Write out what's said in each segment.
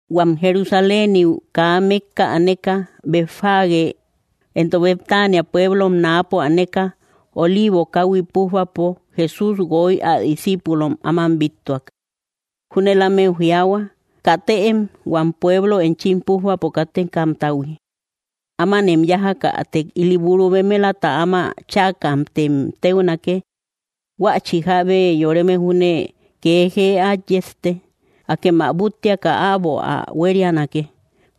Huam Jerusaléniu kaa mékka aneka, Betfagé, entok Betánia pueblom náapo aneka, Oliivo káhui pújbapo, Jesús guoy ä discíipulom áman bíttuak. Júnel ámeu jiaahua: —Katëem, huam pueblou enchim pújbapo kátekamtahui. Ámanem yájakätek ili buru bemelata áma chäkamtem téunake; huächi jábe yoreme júne kee jee át yejte. Akem ä búttiaka äbo ä huérianake.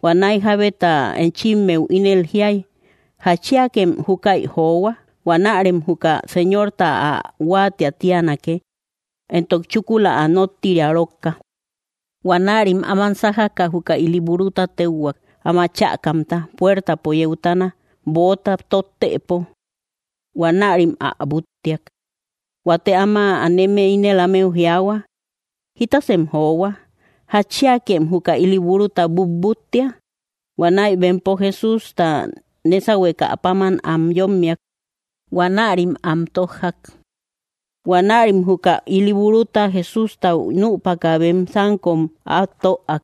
Huanäi jábeta enchimmeu ínel jiay: “¿Jatchiakem júkäi johua?” Huanärem juka Señorta ä huáatiä tíanake, entok chúkula ä nóttiria rókka. Huanärim áman sájaka, juka ili buruta téuhuak áma chäkamta puértapo yeutana, böota tottëpo. Huanärim ä búttiak. Huate áma aneme ínel ámeu jiaahua: —¿Jitasem johua? ¿Jatchiíakem juka ili buruta butbúttia? Huanäi bempo Jesústa nésahuekä páman am yommiak. Huanärim am tójjak. Huanärim juka ili buruta Jesústau nüpaka, bem sánkom at töak.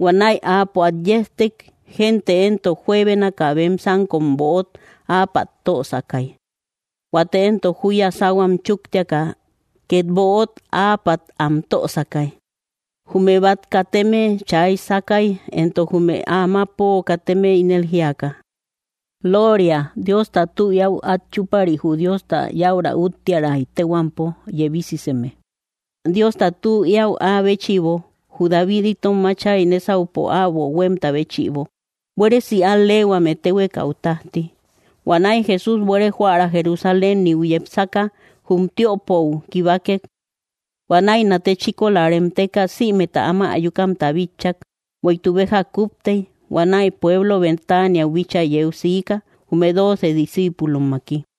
Huanäi Áapo at yejtek. Gente éntok juebénaka bem sánkom böot áapat tösakay; huate éntok júya sáhuam chúktiaka, ket böot áapat am tösakay. Jume bat kateme chay sákay entok jume amapo kateme ínel jíaka: —¡Looria! ¡Diosta tü eäu at chúpari jü Diosta yaura úttiäray téhuampo yebisiseme! ¡Diosta tü eäu áa béchïbo, jü David itom áchay nésahuepo äbo huémta béchïbo! ¡Buéresi al‑leehuame téhuekau tájti! Huanäi Jesús buere joära Jerusaléniu yepsaka, jum tiöpou kibakek. Huanäi nate chíkola reemteka, sïmeta áma ayukamta bitchak. Bueïtuk beja kúptey huanäi pueblo Betániau bíchaa yeu siika, jume dóoce discípulommaki.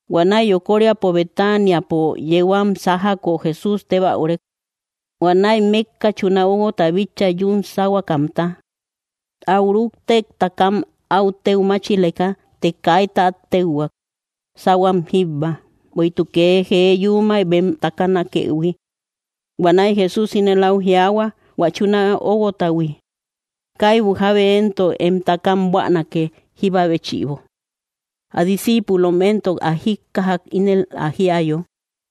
Huanäi yokoríapo Betaniapo yeu am sájako, Jesús tébäurek. Huanäi mékka chuna óguota bitchak yún sáhuakamta. Áu rúktek takam áu téu máchileka, të kaita at téuhuak, sáhuam jíbba, bueïtuk kee jee yuumay bem takanakëhui. Huanäi Jesús ínel au jiaahua hua chuna óguotahui: —Kaibu jábe éntok em taka buänake, jíba béchïbo. Ä discíipulom éntok ä jíkkajak ínel ä jíayo.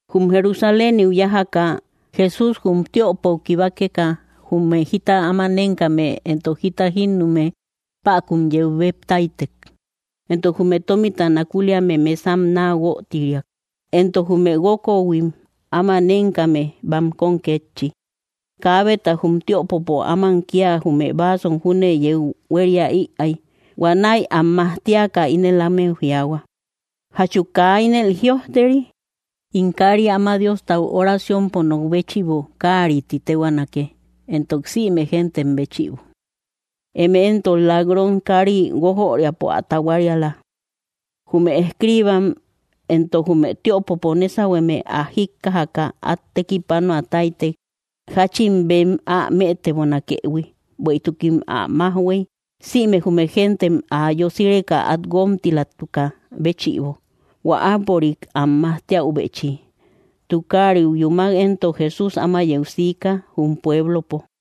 Jum Jerusaléniu yájaka, Jesús jum tiöpou kibakeka, jume jita áma nénkame entok jita jínnume päkun yeu bep táytek. Entok jume tómita nakuliame mesam naa guötiriak, entok jume guókohuim áma nénkame bankom kétchi. Kaabeta jum tiöpopo áman kia jume vasom júne yeu huéria ïay. Huanäi am majtiaka, ínel ámeu jiaahua: —¿Jachu kaa ínel jïojteri? “In káari áma Diostau oraciompo nok béchïbo káari ti téhuaanake entok sïme géntem béchïbo.” Eme éntok lak‑ron kári guójoriäpo ä tahuariala. Jume escribam éntok jume tiöpopo nésahueme ä jíkkajaka, at tekipánoa táytek, jáchin bem ä mëtebonakëhui, bueïtukim ä májhuei, sïme jume géntem ä yosireka at guómtilatukä béchïbo hua áapörik am majtíäubechi. Tukáriu yúmak éntok Jesús áma yeu siikä jum puéblopo.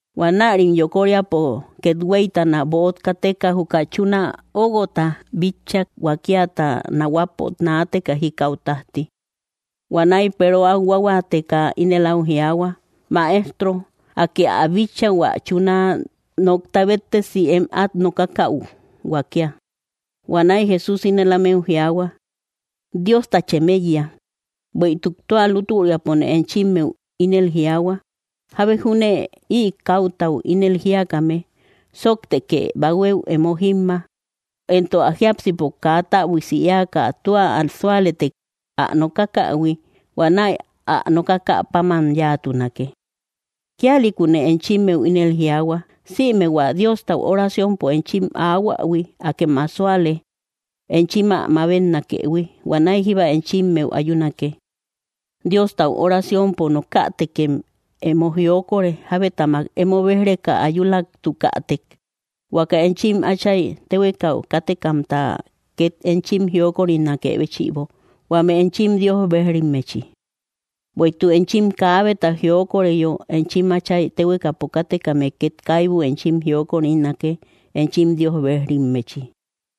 Huanärim yokóriapo kethueitana böot kateka, juka chuna óuguota bitchak huakíata nahuapo naateka jikau tajti. Huanäi Peero au huahuáateka ínel au jiaahua: —Maestro, Akë ä bitcha hua chuuna nokta béttesi em at nokakau huakía. Huanäi Jesús ínel ámeu jiaahua: —Dióstachem eiya. Bueïtuk tua lútaüriapone enchimeu ínel jiaahua, jábe júne ï kautau ínel jíakame: “Sóoktekë, bahuéu emo jimma”, éntok ä jiápsipo kaa täbuiasi éaka tua ä súalëtek ä nokákähui, huanäi ä nokákä páman yáatunake. Kíalïkune enchimeu ínel jiaahua, sïme hua Diostau oraciompo enchim aahuähui, akem ä súale enchim ä mabetnakëhui, huanäi jíba enchimeu ayúnake. Diostau oraciompo nokätekem emo jiokore, jabetamak emo béj‑reka ayulaatukätek, huaka enchim Átchay téhuekau kátekamta ket enchim jiokorinakë béchïbo, huame enchim Dios bejrimmechi. Bueïtuk enchim kaabeta jiokoreyo, enchim Átchay téhuekau katekame ket kaibu enchim jiokorinake enchim Dios bejrimmechi.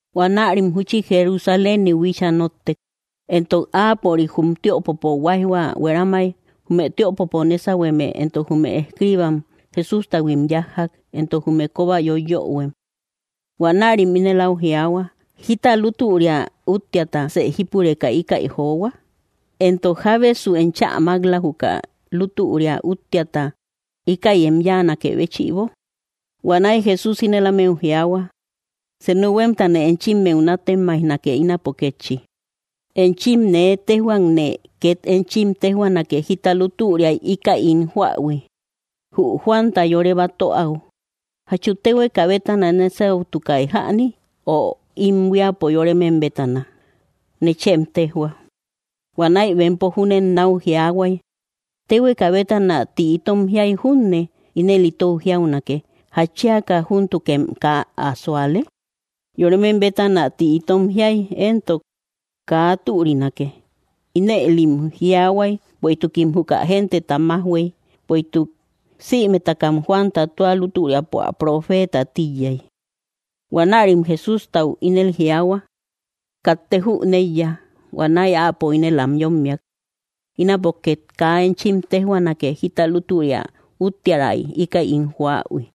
Huanärim júchi Jerusaléniu bíchaa nóttek, éntok áapörik jum tiöpopo huaijhua hueramai, jume tiöpopo nésauhueme éntok jume escribam Jesústahuim yájjak, éntok jume koba yoiyoöhuem. Huanärim ínel au jiaahua: —¿Jita lútüria úttiatasë jípureka íkäi johua? Éntok, ¿Jábesu enchä mak‑la juka lútüria úttiata íkäi em yáanakë béchïbo? Huanäi Jesús ínel ámeu jiaahua: —Senu huémtane enchimmeu nátemaijnake ínapo kétchi. Enchim nee téjhuakne ket enchim téjhuanake jita lútüriai íkäi ín joähui. Jü Juanta yore batöau, ¿jachu téhueka bétana nésautukai jäni, ö im buíapo yoremem bétana? Nechem téjhua. Huanäi bempo júnen nau jiaahuay: —Téhueka bétana tï itom jiai junne, ínel itou jiaunake: “¿Jatchíaka júntukem kaa ä súalek?” Yoremem bétana ti itom jíäi éntok kaa türinake. Ínëlim jiaahuay bueïtukim juka genteta majhuëi, bueïtuk sïmetakam Juanta tua lútüriapo ä proféta tíiyai. Huanärim Jesústau ínel jiaahua: —Katte jüneiya. Huanäi Áapo ínel am yommiak: —Ínapo ket kaa enchim téjhuanake jita lútüria úttiärai íkäi ín joähui.